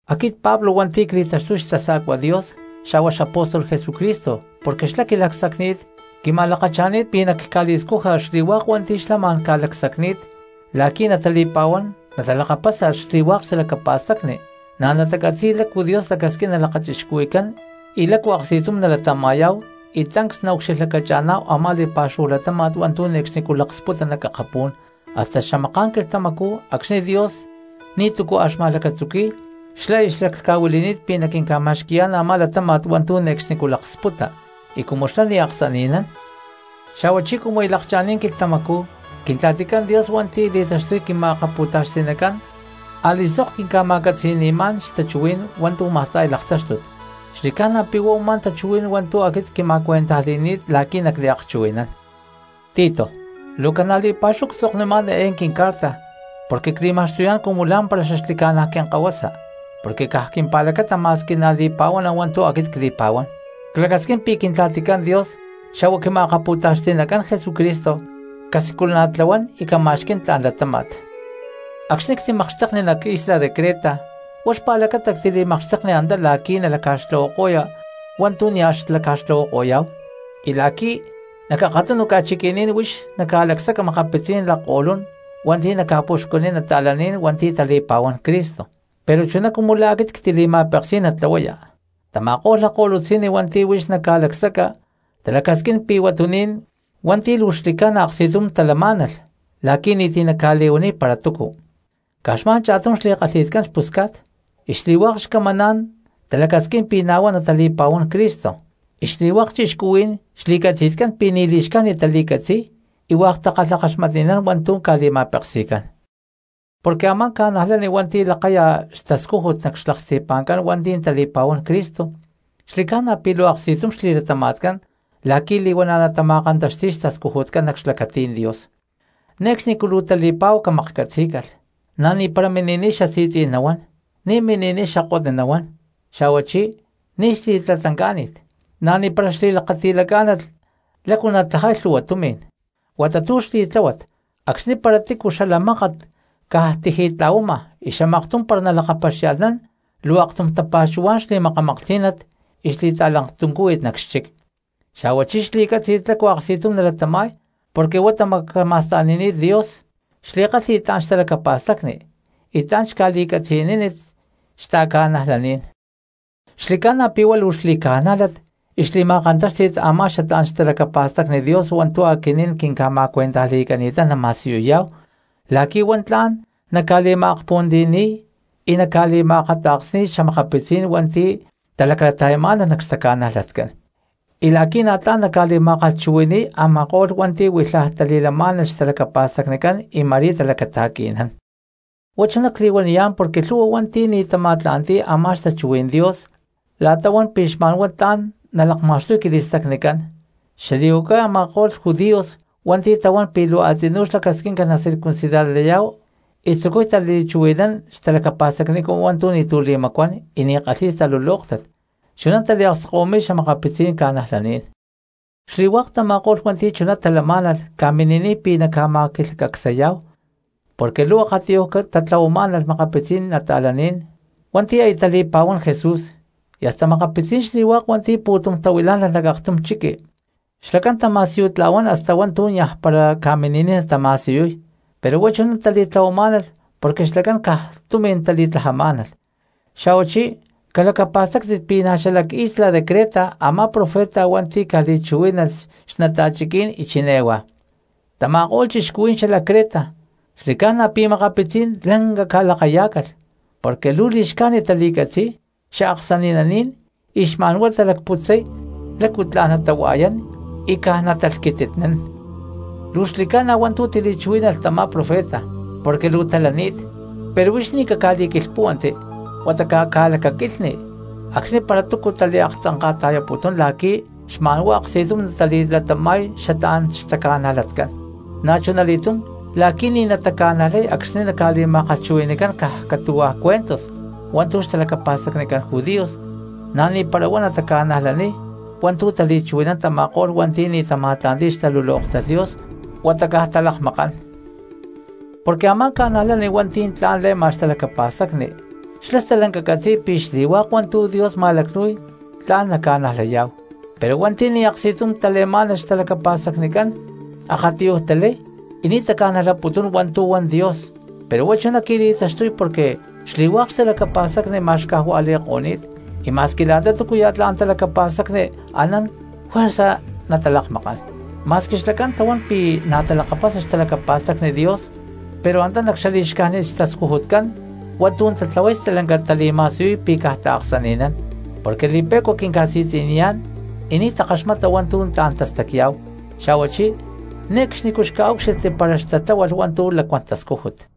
Aquit Pablo hua̠nti̠ cli̠taxtuy xtasa̠cua Dios xa̠hua xapóstol Jesucristo porque xlá quili̠lacsacni̠t quima̠lakacha̠ni̠t pi̠ nacca̠li̠scuja xli̠hua̠k hua̠nti̠ xlá ma̠n ca̠lacsacni̠t la̠qui̠ natali̠pa̠huán natalakapasa xli̠hua̠k xtalacapa̠stacni, na̠ natacatzi̠y lácu Dios lacasquín nalakachixcuhui̠cán y lácu aksti̠tum nalatama̠yá̠hu y tancs naucxilhlacacha̠ná̠hu a̠má li̠pa̠xúhu latáma̠t hua̠ntu̠ ne̠cxnicú laksputa nac akapú̠n. Hasta xamaká̠n quilhtamacú acxni̠ Dios ni̠tu̠cu a̠ xma̠lacatzuqui̠y xlá aya xlaclhca̠huili̠ni̠t pi̠ naquinca̠ma̠xqui̠yá̠n a̠má latáma̠t hua̠ntu̠ ne̠cxnicú laksputa; y cumu xlá ni̠ aksani̠nán, xa̠huachí cumu aya lakcha̠ni̠t quilhtamacú, Quintla̠ticán Dios hua̠nti̠ li̠taxtuy quima̠akapu̠taxti̠nacán a̠li̠sok quinca̠ma̠catzi̠ni̠mán xtachuhuí̠n hua̠ntu̠ ma̠sta̠y laktáxtut; xli̠ca̠na pi̠ huá u̠má tachuhuí̠n hua̠ntu̠ aquit quima̠cuentajli̠ni̠t la̠qui̠ nacliakchuhui̠nán. Tito, luu ca̠na li̠pa̠xúhu ctzoknimá̠n eé quincarta porque cli̠ma̠xtuyá̠n cumu lá̠mpara xaxli̠ca̠na quinkahuasa porque caj quimpa̠lacata ma̠squi na̠ li̠pa̠huana hua̠ntu̠ aquit cli̠pa̠huán; clacasquín pi̠ Quintla̠ticán Dios xa̠hua Quima̠akapu̠taxti̠nacán Jesucristo casiculana̠tlahuán y cama̠xquí̠n tla̠n latáma̠t. Acxni̠ ctimakxtekni nac isla de Creta huá xpa̠lacata ctili̠makxtekni antá la̠qui̠ nalaca̠xtlahuako̠ya hua̠ntu̠ nia̠ xlaca̠tlahuako̠yá̠hu y la̠qui̠ nac akatunu ca̠chiqui̠ní̠n huix naca̠lacsaca makapitzí̠n lakko̠lún hua̠nti̠ naca̠puxcuniy cristianos hua̠nti̠ tali̠pa̠huán Cristo, pero chuná cumu la̠ aquit ctili̠ma̠peksí̠n natlahuaya. Tama̠ko̠lh lakko̠lutzi̠nni hua̠nti̠ huix naca̠lacsaca talacasquín pi̠ huatuní̠n hua̠nti̠ luu xli̠ca̠na aksti̠tum talamá̠nalh la̠qui̠ ni̠ti̠ naca̠li̠huaniy para túcu. Caj xma̠n cha̠tum xli̠kalhi̠tcán xpusca̠t, y xli̠hua̠k xcamancán talacasquín pi̠ na̠ huá natali̠pa̠huán Cristo, y xli̠hua̠k cristianos xli̠catzi̠tcán pi̠ ni̠ li̠xcájnit tali̠catzi̠y y hua̠k takalhakaxmatni̠nán hua̠ntu̠ ca̠li̠ma̠peksi̠cán. Porque a̠má cristiano hua̠nti̠ lakaya xtascújut nac xlaksti̠pa̠ncán hua̠nti̠ tali̠pa̠huán Cristo xli̠ca̠na pi̠ luu aksti̠tum xli̠latama̠tcán la̠qui̠ li̠huana̠ natama̠kantaxti̠y xtascujutcán nac xlacatí̠n Dios. Ne̠cxnicú luu tali̠pa̠hu camaklhcatzí̠calh, na̠ ni̠para mini̠niy xasi̠tzí̠n nahuán, ni̠ mini̠niy xakotni nahuán, xa̠huachí ni̠ xli̠tatlancá̠ni̠t, na̠ ni̠para xli̠lakati̠lacá̠nat lácu natlajay lhu̠hua tumi̠n. Huata tu̠ xli̠tláhuat acxni̠ para tícu xala mákat caj tiji̠tla̠huama y xamaktum para nalakapaxia̠lhnán luu aktum tapa̠xuhuá̠n xli̠ma̠kamaklhtí̠nat y xli̠talaktuncúhuit nac xchic, xa̠huachí xli̠cátzi̠t lácu aksti̠tum nalatama̠y porque huá tamacama̠sta̠nini̠t Dios, xli̠kálhi̠t tla̠n xtalacapa̠stacni y tla̠n xca̠li̠catzi̠niní̠t xta̠cristianos. Xli̠ca̠na pi̠ huá luu xli̠ca̠nájlat y xli̠ma̠kantáxti̠t a̠má xatlá̠n xtalacapa̠stacni Dios hua̠ntu̠ aquinín quinca̠ma̠cuentajli̠cani̠tán nama̠siyuyá̠hu la̠qui̠ huá tla̠n naca̠li̠ma̠akpuhuantiyani̠y y naca̠li̠ma̠akata̠ksni̠y xa̠makapitzí̠n hua̠nti̠ talaclata̠yamá̠nalh nac xtaca̠najlatcán, y la̠qui̠ na̠ tla̠n naca̠li̠ma̠kalhchuhui̠ni̠y a̠ma̠ko̠lh hua̠nti̠ huilhaj tali̠lamá̠nalh xtalacapa̠stacnicán y ma̠rí talacata̠qui̠nán. Huá chuná cli̠huaniyá̠n porque lhu̠hua hua̠nti̠ ni̠ tama̠tla̠nti̠y a̠má xtachuhuí̠n Dios la̠ta huán pi̠ xma̠nhuá tla̠n naca̠lakma̠xtuy quili̠stacnicán, xali̠huacay a̠ma̠ko̠lh judíos hua̠nti̠ tahuán pi̠ luu a̠tzinú xlacasquinca nacircuncidarlayá̠hu, y tzucuy tali̠chuhui̠nán xtalacapa̠stacnicán hua̠ntu̠ ni̠tu̠ li̠macuán y ni̠ kalhi̠y talulóktat chuná taliakskahuimi̠y xa̠makapitzí̠n cristianos. Xli̠hua̠k tama̠ko̠lh hua̠nti̠ chuná talamá̠nalh ca̠mini̠niy pi̠ naca̠ma̠quilhcacsayá̠hu porque luu akatiyuj tatlahuamá̠nalh makapitzí̠n cristianos hua̠nti̠ aya tali̠pa̠huán Jesús y hasta makapitzí̠n xli̠hua̠k hua̠ntu̠ pu̠tum tahuilá̠nalh nac aktum chiqui. Xlacán tama̠siyutla̠huán hasta hua̠ntu̠ niaj para ca̠mini̠niy natama̠siyuy, pero huá chuná tali̠tlahuamá̠nalh porque xlacán caj tumi̠n tali̠tlajamá̠nalh. Xa̠huachí calacapa̠stáctit pi̠ na̠ xalac isla de Creta a̠má profeta hua̠nti̠ ca̠li̠chuhuí̠nalh xnata̠chiquí̠n y chiné huá: “Tama̠ko̠lh cristianos xalac Creta xli̠ca̠na pi̠ makapitzí̠n lanca ca̠lakayá̠calh, porque luu li̠xcájnit tali̠catzi̠y, xaaksani̠naní̠n y xma̠n huá talacputzay lácu tla̠n natahua̠yán y caj natalhquititnán.” Luu xli̠ca̠na hua̠ntu̠ tili̠chuhuí̠nalh tamá profeta porque luu talani̠t, pero huix ni̠ caca̠li̠quilhpúhuanti huata caca̠lacaquilhni acxni̠ para túcu taliaktzanka̠ta̠yaputún la̠qui̠ xma̠n huá aksti̠tum natali̠latama̠y xatlá̠n xtaca̠najlatcán, na̠chuna li̠túm la̠qui̠ ni̠ nataca̠najlay acxni̠ naca̠li̠ma̠kalhchuhui̠ni̠cán caj catu̠hua̠ cuentos hua̠ntu̠ xtalacapa̠stacnicán judíos, na̠ ni̠para huá nataca̠najlaniy hua̠ntu̠ tali̠chuhui̠nán tama̠ko̠lh hua̠nti̠ ni̠ tama̠tla̠nti̠y xtalulóktat Dios huata caj talakmakán. Porque a̠má cristiano hua̠nti̠ tla̠n le̠ma xtalacapa̠stacni xlá stalanca catzi̠y pi̠ xli̠hua̠k hua̠ntu̠ Dios ma̠lacnu̠y tla̠n naca̠najlayá̠hu, pero hua̠nti̠ ni̠ aksti̠tum tale̠má̠nalh xtalacapa̠stacnicán akatiyuj talay y ni̠ taca̠najlaputún hua̠ntu̠ huan Dios, pero huá chuná qui̠li̠taxtuy porque xli̠hua̠k xtalacapa̠stacni ma̠xcajua̠li̠ko̠ni̠t y ma̠squi la̠ta túcuya̠ tla̠n talacapa̠stacni anán juerza natalakmakán. Ma̠squi xlacán tahuán pi̠ na̠ talakapasa xtalacapa̠stacni Dios pero antá nac xali̠xcájnit xtascujutcán hua̠ntu̠ tatlahuay stalanca tali̠ma̠siyuy pi̠ caj taaksani̠nán porque li̠pe̠cua quinca̠si̠tzi̠niyá̠n y ni̠ takaxmata hua̠ntu̠ tla̠n tastacya̠hu xa̠huachí ne̠cxnicú xca̠úcxilhti para xtatláhualh hua̠ntu̠ lacuán tascújut.